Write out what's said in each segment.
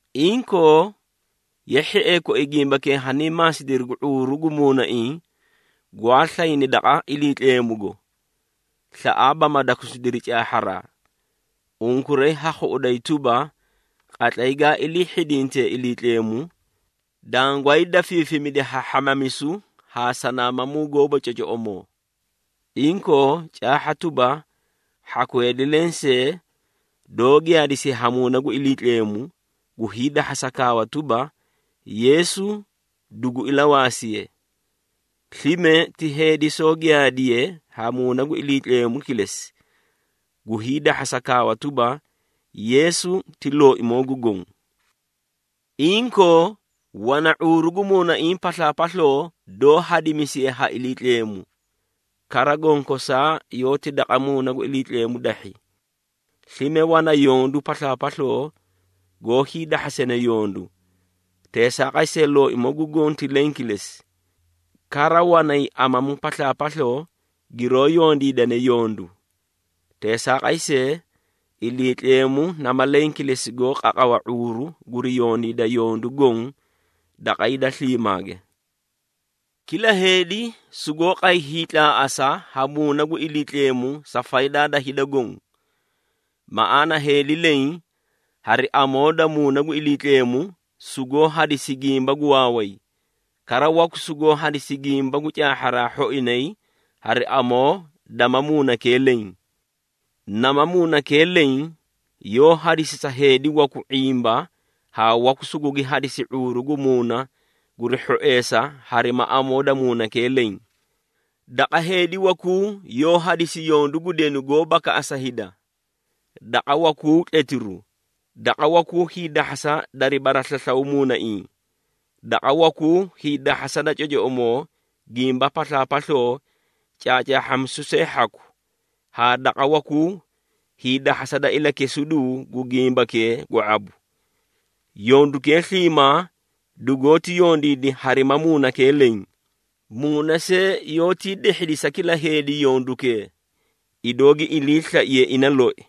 Inkoo, ye hhiee koi gimbakee hanii maasidiri gu ⁄uuru gu muunaiĩ gwaa slayni daqa Iliitleemugo, slaꞌaaba ma dakusidiri caahharaa. Unkuray ha khuꞌuday tuba, qatlay gaa ilii hhidintee Iliitleemu, dangwaay dafiifimidi ha hhamamisu haa sanaamamuu gooba cocoꞌomoo. Inkoo, caahha tuba, hhaku heedi lensee doó giyaadisiye ha Muuna gu Iliitleemu, gu hiidahhasa kaawa tuba, “Yeesu dugu ilawaasiye.” Slime ti heedi soó giyaadiye ha Muuna gu Iliitleemu kilesi, gu hiidahhasa kaawa tuba, “Yeesu ti Looimoo gu Goõ.” Inkoo, wana ⁄uuru gu muunaiĩ paslaapasloo doó hadimisiye ha Iliitleemu. Kara, gonkosaa yoóti daqa Muuna gu Iliitleemu dahhi. Slime wana yondu paslaapasloo goó hiidahhasane yondu, teesaaqay see Looimoo gu Goõ ti leẽ kilesi. Kara, wanay amamu paslaapasloo giroó yondiidane yondu. Teesaaqay see, Iliitleemu nama leẽ kilesi goó qaqawa ⁄uuru guri yondiida yondu goõ daqa hida sliimaage. Kila heedi sugoó qay hiitlaaꞌasa ha Muuna gu Iliitleemu sa faydaa da hida goõ. Maꞌaana heedi leẽ hari amoo da Muuna gu Iliitleemu, sugoó hadisi gimba gu waaway, kara waku sugoó hadisi gimba gu caahharaa hhoinay hari amoo dama Muunakee leẽ. Nama Muunakee leẽ yoó hadisi sa heedi waku ⁄imba haa waku sugugi hadisi ⁄uuru gu muuna guri hhoeesa harima amoo da Muunakee leẽ. Daqa heedi wakuu yoó hadisi yondu gu denu goó bakaꞌasa hida, daqa wakuu tletiru, daqa wakuu hiidahhasa dari baraslaslaw muunaiĩ, daqa wakuu hiidahhasa da cocoꞌomoo gimba paslaapasloo caacaahhamisu see hhaku, haa daqa wakuu hiidahhasa da ilakesiduu gu gimbakee gu ⁄abu. Yondukee sliimaa dugoóti yondiidi harima Muunakee leẽ, Muuna see yoótii dehhidi sa kila heedi yondukee, idoo giyoó iliislaiye ina loi.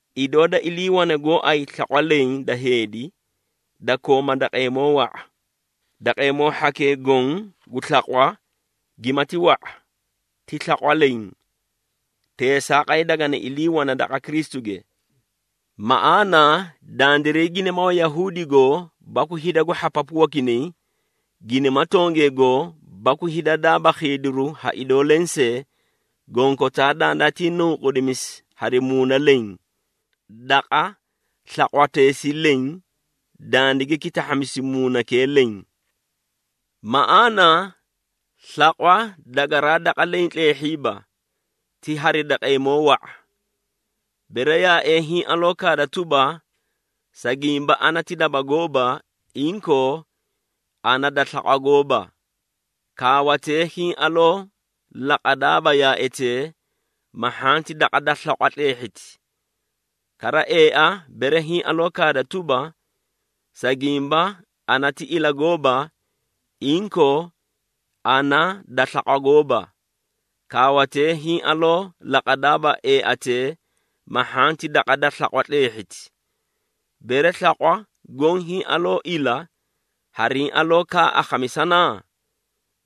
Idoo da iliiwane gooay slaqwa leẽ da heedi, da kooma daqeemoo wa⁄a, daqeemoo hhakee goõ gu slaqwa, gimati wa⁄a, ti slaqwa leẽ. Teesaaqay dagani ilii wana daqa Kristuge. Maꞌaana dandiray ginima Wayahuudigoo baku hida gu hhapapu wakinay, ginima tongegoo baku hida daaba khiidiru ha idoo lensee, gonkotaa dandaatii nunqudimisi hari Muuna leẽ, daqa slaqwateesii leẽ, dandigi kitahhamisi Muunakee leẽ. Maꞌaana, slaqwa dagaraa daqa leẽ tleehhiiba, ti hari daqeemoo wa⁄a. Bere yaaee hiĩ aloo kaada tuba, “Sa gimba ana ti daba gooba, inkoo, ana da slaqwa gooba,” kaawatee hiĩ aloo laqadaaba yaaetee, ma hhanti daqa da slaqwa tleehhiti. Kara, eea bere hiĩ aloo kaada tuba, “Sa gimba ana ti ila gooba, inkoo, ana da slaqwa gooba,” kaawatee hiĩ aloo laqadaaba eeatee, ma hhanti daqa da slaqwa tleehhiti. Bere slaqwa goõ hiĩ aloo ila, hariĩ aloo kaa akhamisana?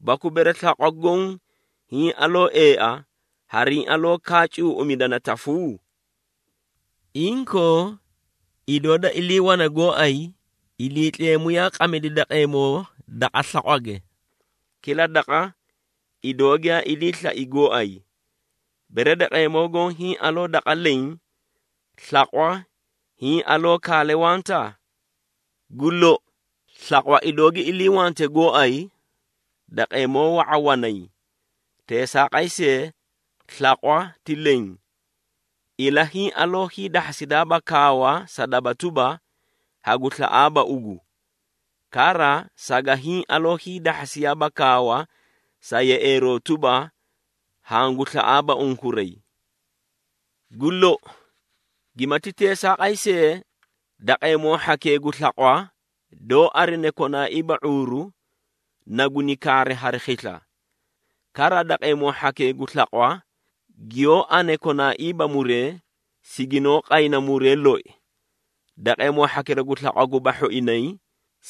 Baku bere slaqwa goõ hiĩ aloo eea, hariĩ aloo kaa cuuꞌumidana tafu? Inkoo, idoo da iliiwane gooay, Iliitleemu yaa qamidi daqeemoo daqa slaqwage, kila daqa idoo giyaa ilii slai gooay. Bere daqeemoo goõ hiĩ aloo daqa leẽ, slaqwa hiĩ aloo kaale wanta? Gu lou, slaqwa idoo gi iliiwante gooay, daqeemoo wa⁄a wanay. Teesaaqay see, slaqwa ti leẽ. Ila hiĩ aloo hiidahhasidaaba kaawa sa daba tuba, “Hagu slaꞌaaba ugu!” Kara saga hiĩ aloo hiidahhasiiyaaba kaawa sa yeꞌeeroo tuba, “Hangu slaꞌaaba unkuray!” Gu lou, gimati teesaaqay see, daqeemoo hhakee gu slaqwa, doó arine konaaiiba ⁄uuru, na guni kaari hari khisla. Kara, daqeemoo hhakee gu slaqwa giyoó ane konaaiiba muree, siginoó qayna muree loi. Daqeemoo hhakira gu slaqwa guba hhoinay,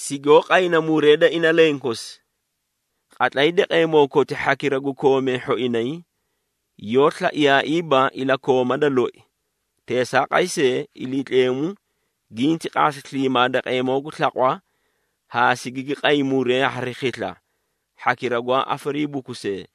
sigoó qayna muree da ina lenkosi. Qatlay daqeemoo koti hhakira gu koomee hhoinay, yoó slaiyaaiiba ilakooma da loi, teesaaqay see, Iliitleemu ginti qaasi sliimaa daqeemoo gu slaqwa haa sigigi qay muree hari khisla hhakira gwaa afariibukusee.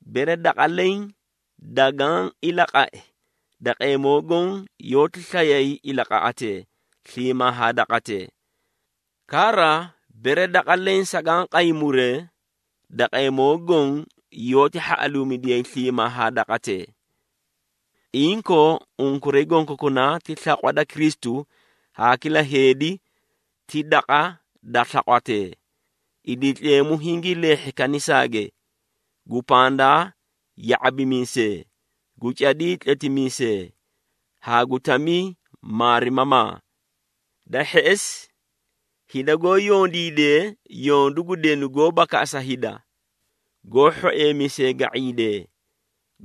Bere daqa leẽ dagaã ilaqai, daqeemoo goõ yoóti slayay ilaqaꞌatee sliimaa haa daqatee. Kara, bere daqa leẽ sagaã qay muree, daqeemoo goõ yoóti hhaꞌaluumidiyay sliimaa haa daqatee. Inkoo, unkuray gonkokunaa ti slaqwa da Kristu haa kila heedi ti daqa da slaqwatee. Iliitleemu hingii leehhi kanisaage, gu pandaa ya⁄abimiisee, gu cadii tletimiisee haa gu tamii maarimamaa. Da hheꞌesi hida goó yondiidee yondu gu denu goó bakaꞌasa hida, goó hhoeemisee ga⁄iidee,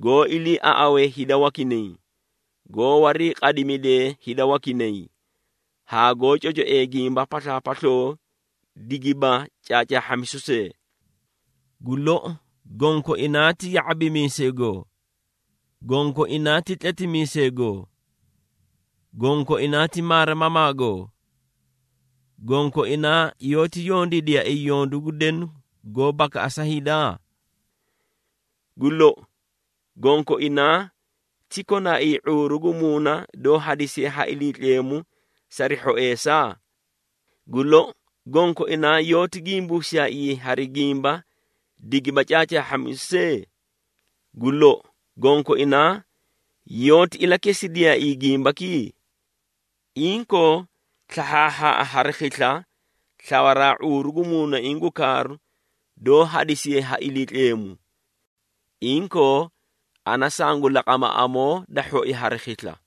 goó iliiaꞌawee hida wakinay, goó wariiqadimidee hida wakinay, haa goó cocoee gimba paslaapasloo digiba caacaahhamisu see. Gu lou, gonkoinaa ti ya⁄abimiiseegoo? Gonkoinaa ti tletimiiseegoo? Gonkoinaa ti maarimamaagoo? Gonkoinaa yoóti yondiidiyaaii yondu gu denu goó bakaꞌasa hida? Gu lou, gonkoinaa ti konaaii ⁄uuru gu muuna doó hadisiye ha Iliitleemu sari hhoeesa? Gu lou, gonkoinaa yoóti gimbuusiyaaii hari gimba digiba caacaahhamisu see? Gu lou, gonkoinaa yoóti ilakesidiyaaii gimbaki? Inkoo, slahhaahhaaꞌa hari khisla slawaraa ⁄uuru gu muunaiĩ gu kaaru, doó hadisiye ha Iliitleemu. Inkoo, ana sangu laqama amoo da hhoi hari khisla.